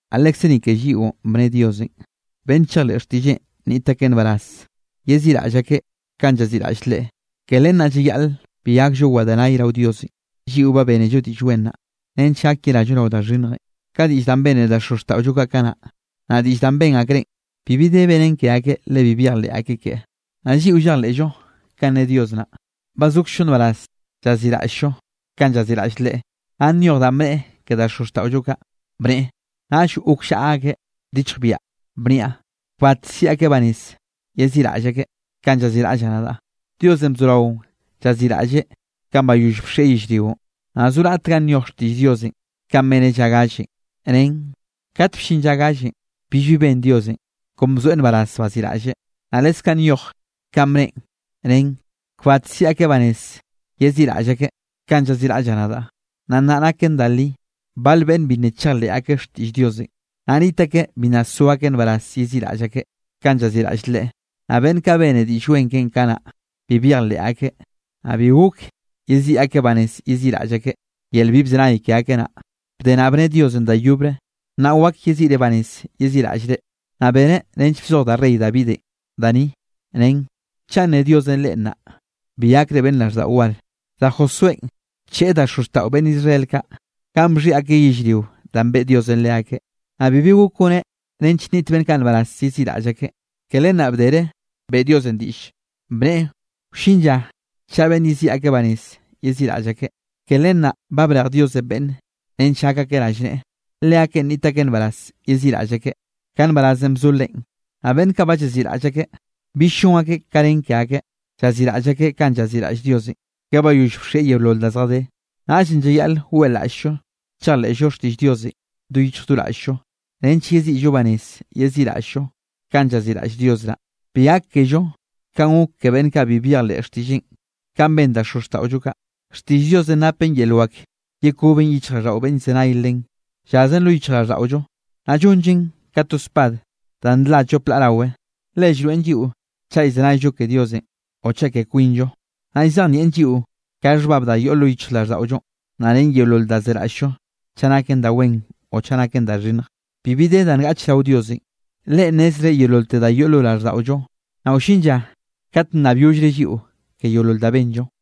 Naꞌ lekze ni ke lliꞌon bne Diosenꞌ, beꞌnn chejleꞌ xtiꞌlleꞌn nniꞌt akeꞌ nbaraz yeziꞌraꞌll akeꞌ kanꞌ llaziꞌraꞌll Leꞌe. Ke len naꞌ llayaꞌl bi gakllo wedenay rao Diosenꞌ. Lliꞌo ba bénello Diꞌll Wen naꞌ, nench gak yerallo rao da xhinnjenꞌ, ka diꞌll danꞌ bene da xozxtaꞌollo kaꞌ kanaꞌ, naꞌ diꞌll danꞌ ben akreꞌn, bibi de benen ke akeꞌ le bi byejleꞌ akeꞌ keꞌe. Naꞌ lliꞌo llejleꞌllo kanꞌ ne Dios naꞌ, ba zokzllo nbaraz llaziꞌraꞌll-llo kanꞌ llaziꞌraꞌll Leꞌe. Naꞌ nyoj danꞌ bneꞌe ke da xozxtaꞌollo kaꞌ, bneꞌe: Naꞌll gokllaꞌa akeꞌ bdichjbiaꞌ, bniaꞌ: “Kbat siꞌi akeꞌ banez yeziꞌraꞌll akeꞌ kanꞌ llaziꞌraꞌllaꞌ nadaꞌ.” Diosenꞌ bzorao llaziꞌraꞌlleꞌ kanꞌ bayoll bxieꞌ yellrionꞌ. Naꞌ zo raꞌt ganꞌ nyoj xtiꞌll Diosenꞌ kanꞌ beneꞌ lla gallenꞌ, nen: Kat bllin lla gallenꞌ, billbi ben Diosenꞌ, kon bzoeꞌ nbaraz baziꞌraꞌlleꞌ. Naꞌ leskaꞌ nyoj kanꞌ bneꞌen, nen: Kbat siꞌi akeꞌ banez yeziꞌraꞌll akeꞌ kanꞌ llaziꞌraꞌllaꞌ nadaꞌ. Naꞌ nna naken da li, bal beꞌnn bi nna chejleꞌ akeꞌ xtiꞌll Diosenꞌ, naꞌ niꞌt akeꞌ bi nna so akeꞌ nbaraz yeziꞌraꞌll akeꞌ, kanꞌ llaziꞌraꞌll Leꞌe, naꞌ beꞌnn kaꞌ bene Diꞌll Wen keꞌen kanaꞌ bi byejleꞌ akeꞌ, naꞌ bi gok yeziꞌi akeꞌ banez yeziꞌraꞌll akeꞌ, yel bi bzenay ke akeꞌ naꞌ. Bde naꞌ bne Diosenꞌ da yobre: “Nnaꞌ wak yeziꞌre banez yeziꞌraꞌllre.” Naꞌ beneꞌ nench bzoj da rey Davidenꞌ da ni, nen: Chaꞌ nne Diosenꞌ reꞌ nnaꞌ, bi gakre beꞌnn raꞌlldaꞌo war. Da Josuénꞌ bcheꞌe da xozxtaꞌo beꞌnn Israel kaꞌ, ganꞌ bxhiꞌi akeꞌ yellrio danꞌ beꞌe Diosenꞌ leakeꞌ, naꞌ bibi gok goneꞌ nench nniꞌt beꞌnn kaꞌ nbaraz yeziꞌraꞌll akeꞌ. Ke len naꞌ bdere beꞌe Diosenꞌ diꞌll, bneꞌe wllin lla chaꞌa beꞌnn yeziꞌi akeꞌ banez yeziꞌraꞌll akeꞌ. Ke len naꞌ ba brej Diosenꞌ beꞌnne nench gak akeꞌ rallneꞌe, leakeꞌn nniꞌt akeꞌ nbaraz yeziꞌraꞌll akeꞌ ka nbarazenꞌ bzo Leꞌen. Naꞌ beꞌnn kaꞌ ba llaziꞌraꞌll akeꞌ, bill llon akeꞌ ka nen ke akeꞌ, llaziꞌraꞌll akeꞌ kanꞌ llaziꞌraꞌll Diosenꞌ, ka bayoll bxieꞌ yeolol da zjadé. Naꞌllenꞌ llayaꞌl weꞌlaꞌll-llo chejleꞌllo xtiꞌll Diosenꞌ do yichj do raꞌll-llo, nench yeziꞌllo banez yeziꞌraꞌll-llo kanꞌ llaziꞌraꞌll Dios naꞌ, bi gak kello kanꞌ gok ke beꞌnn kaꞌ bi byejleꞌ xtiꞌlleꞌn kanꞌ ben da xozxtaꞌollo kaꞌ. Xtiꞌll Diosenꞌ napen yel wak yekoben yichjraꞌlldaꞌo beꞌnn llzenay len. Llazen lo yichjraꞌlldaꞌollo, naꞌ llonllen ka to spad da nla llop laꞌ rawe, le llroeꞌn lliꞌo chaꞌ llzenayllo ke Diosenꞌ o chaꞌ ke kwinllo, naꞌ llzejnieꞌn lliꞌo ka xhbab da yoꞌ lo yichjraꞌlldaꞌollonꞌ, naꞌ ren yeolol da zeraꞌll-llo chaꞌ naken da wen o chaꞌ naken da xhinnj. Bibi de da ngaꞌch rao Diosenꞌ. Leꞌen nnezreꞌ yeololte da yoꞌ lo raꞌlldaꞌollo, naꞌ wllin lla kat nnabyollreꞌ lliꞌo ke yeolol da benllo.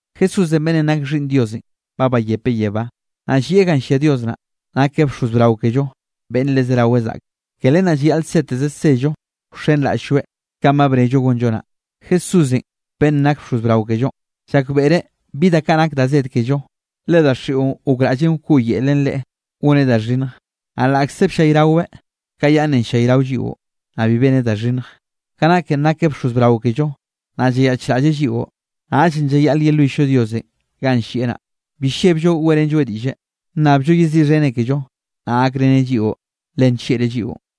Jesúsenꞌ beꞌnnenꞌ nak Xhiꞌnn Diosenꞌ ba bayepeꞌ yebá, naꞌ llieꞌ ganꞌ llia Dios naꞌ. Nakeꞌ bxoz brao kello beꞌnn le zerawe zaꞌkeꞌ. Ke len naꞌ llayaꞌl seteze sello wxenraꞌll-lloeꞌ kanꞌ ba bnello gonllo naꞌ. Jesúsenꞌ beꞌnnenꞌ nak bxoz brao kellonꞌ, llakbeꞌreꞌ bi da kaꞌ nak da zed kello, le daxiꞌon gokraꞌllen wkoꞌyelen Leꞌe goneꞌ da xhinnj, naꞌ laꞌkze bllayraweꞌ ka yaꞌnnenꞌ llayrao lliꞌo, naꞌ bi beneꞌ da xhinnj. Ka naken nakeꞌ bxoz brao kello, naꞌ llayaꞌchraꞌlleꞌ lliꞌo, naꞌllenꞌ llayaꞌl yelwill-llo Diosenꞌ ganꞌ llieꞌ naꞌ, bi llebllo weꞌrenlloeꞌ diꞌlle, nnabllo yeziꞌxheneꞌ kello, naꞌ gakreneꞌ lliꞌo, le nllieꞌreꞌ lliꞌon.